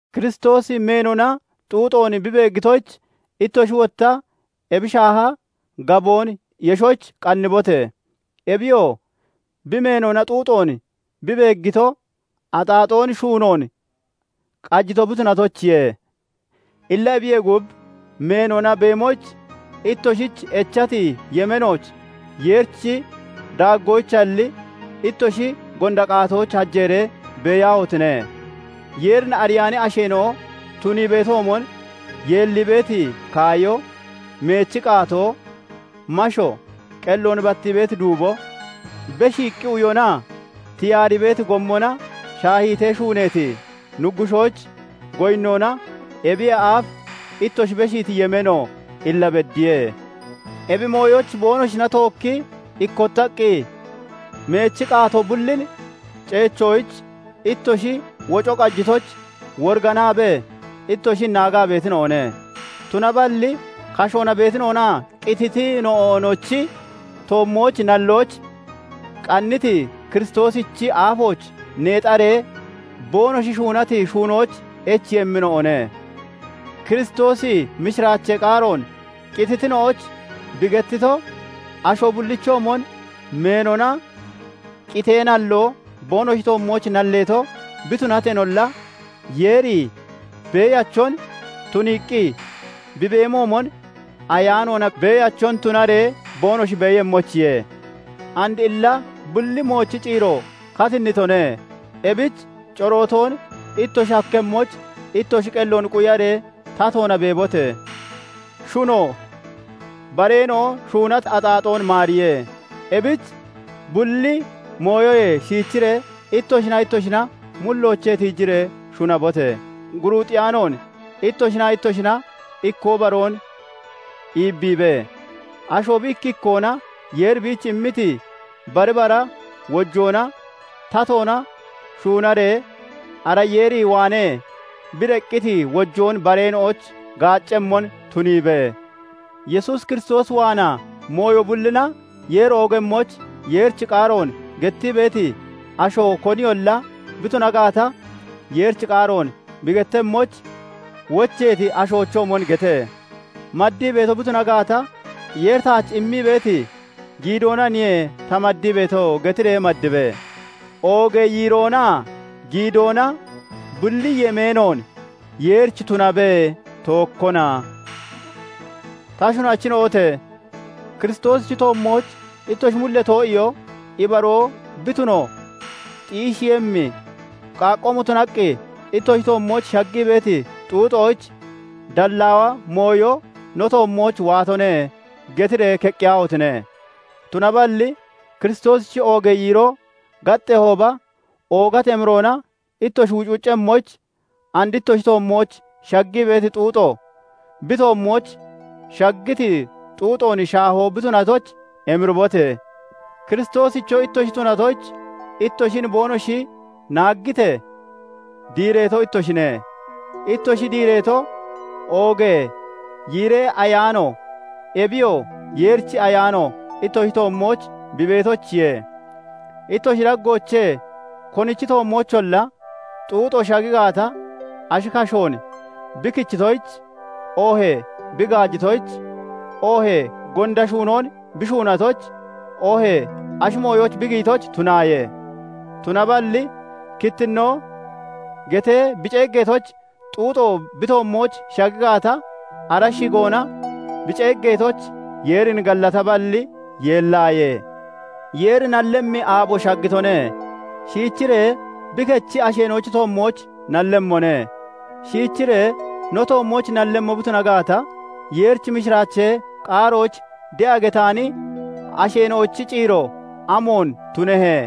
Kiristoosi meenona xuuxoon bi beeggitoyich, ittoshi wotta ebi shaaha gaboon yeshoyich qannibote! Ebiyoo bi meenona xuuxoon bi beeggito, axaaxoon shuunoon qajito bi tunatoyichiye. Illa ebiyee gub meenona beemoyich ittoshich echati yemeenooch Yeerichi daaggoyichalli, ittoshi gonda qaatoyich hajeeree beeyaahotine! Yeerin ariyaani asheena'o tunii beetoomon, yeellii beeti kaayo, meechi qaatoo, masho, qelloon battii beeti duubo, beshiiqqi uyonaa tiyaarii beeti gommona shaahiitee shuuneeti nuggushoyich goyinnoona ebiyee aaf ittoshi beshiiti yemeeno illa beddiye. Ebi mooyoyich boonoshina tookkii ikkottaqqi meechi qaatoo bullin ceechoyich ittoshi woco qajitoyich woriganaabee, ittoshin naagaa beetina'one; tunaballi kashoona beetina'onaa qititina'onochi toommooch nalloyich qanniti Kiristoosichi aafooch neexaree boonoshi shuunati shuunoyich echeeyemmina'one. Kiristoosi mishiraachee qaaroon qititina'oyich bi gettito, asho bullichoomon meenona qitee nalloo boonoshi toommooch nalleeto bi tunateenolla, Yeeri Beeyachon tunaqqi bi beemoomon ayaanoona beeyachon tunaree boonoshi beeyemmoyichiye. And illa bulli moochi ciiro katinnitone. Ebich corootoon ittoshi hakkemmoyich ittoshi qelloon quyaree tatoona beebote! Shuno bareena'o shuunati axaaxoon maariye; ebich bulli mooyoyee shiichiree ittoshinaa ittoshina mulloochee tiijiree shunabote! Guruuxeyaanoon ittoshinaa ittoshina ikkoo baroon iibbiibe. Asho bi ikki ikkoona Yeeri biich immiti bari bara wojoona tatoona shuunaree, ara Yeer waanee bi deqqiti wojoon bareena'oyich gaaccemmon tuniibe. Yesuus Kiristoos waanaa mooyo bullina Yeeri oogemmoyich, Yeerichi qaaroon gettii beeti asho koniyolla bi tuna gaata, Yeerichi qaaroon bi gettemmoyich wocheeti ashoochoomon gete; maddii beeto bi tuna gaata, "Yeeri taach immii beeti giidoonaniye ta maddii beeto" getiree maddibe; oogee yiiroonaa giidoona bulli yemeenoon Yeerich tunabe; tookona. Ta shunachina'ote! Kiristoosichi toommooch ittoshi mullee too'iyoo ibaroo bi tuno xiisheeyemmi, qaaqqoomo tunaqqi ittoshi toommooch shaggii beeti xuuxoyich "Dallaawa mooyo no toommooch waatone" getiree keqqiyaahotine! Tunaballi Kiristoosichi oogee yiiroo gaxxeehooba oogati emiroona ittoshi wucwuccemmoyich, and ittoshi toommooch shaggii beeti xuuxo bi toommooch shaggiti xuuxoon shaahoo bi tunatoyich emiriibote! Kiristoosicho ittoshi tunatoyich ittoshin boonoshi naaggitee, diireeto ittoshine; ittoshi diireetoo, oogee yiiree Ayaano, ebiyoo Yeerichi Ayaano, ittoshi toommooch bi beetoyichiye. Ittoshi daggoochee konichi toommoocholla xuuxo shagi gaata, ashi kashoon bi kichitoyich, oohee bi gaajitoyich, oohee gonda shuunoon bi shuunatoyich, oohee ashi mooyooch bi giyitoyich tunaaye. Tunaballi kittinnoo getee bi ceeggeetoyich xuuxo bi toommooch shagi gaata, ara shigoona bi ceeggeetoyich Yeerin gallataballi, yeellaaye. Yeeri nallemmi aabo shaggitone; shiichiree bi kechi asheena'ochi toommooch nallemmone. Shiichiree no toommooch nallemmo bi tuna gaata, Yeerichi mishiraachee qaaroyich de'a getaani asheena'ochi ciiro amoon tunehe?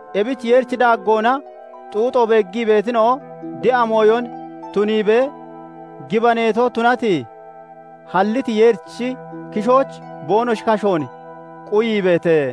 Ebich Yeerichi daaggoona xuuxo beeggii beetina'o, de'a mooyon tuniibee, gibaneeto tunati, halliti Yeerichi kishooch boonoshi kashoon quyiibeete.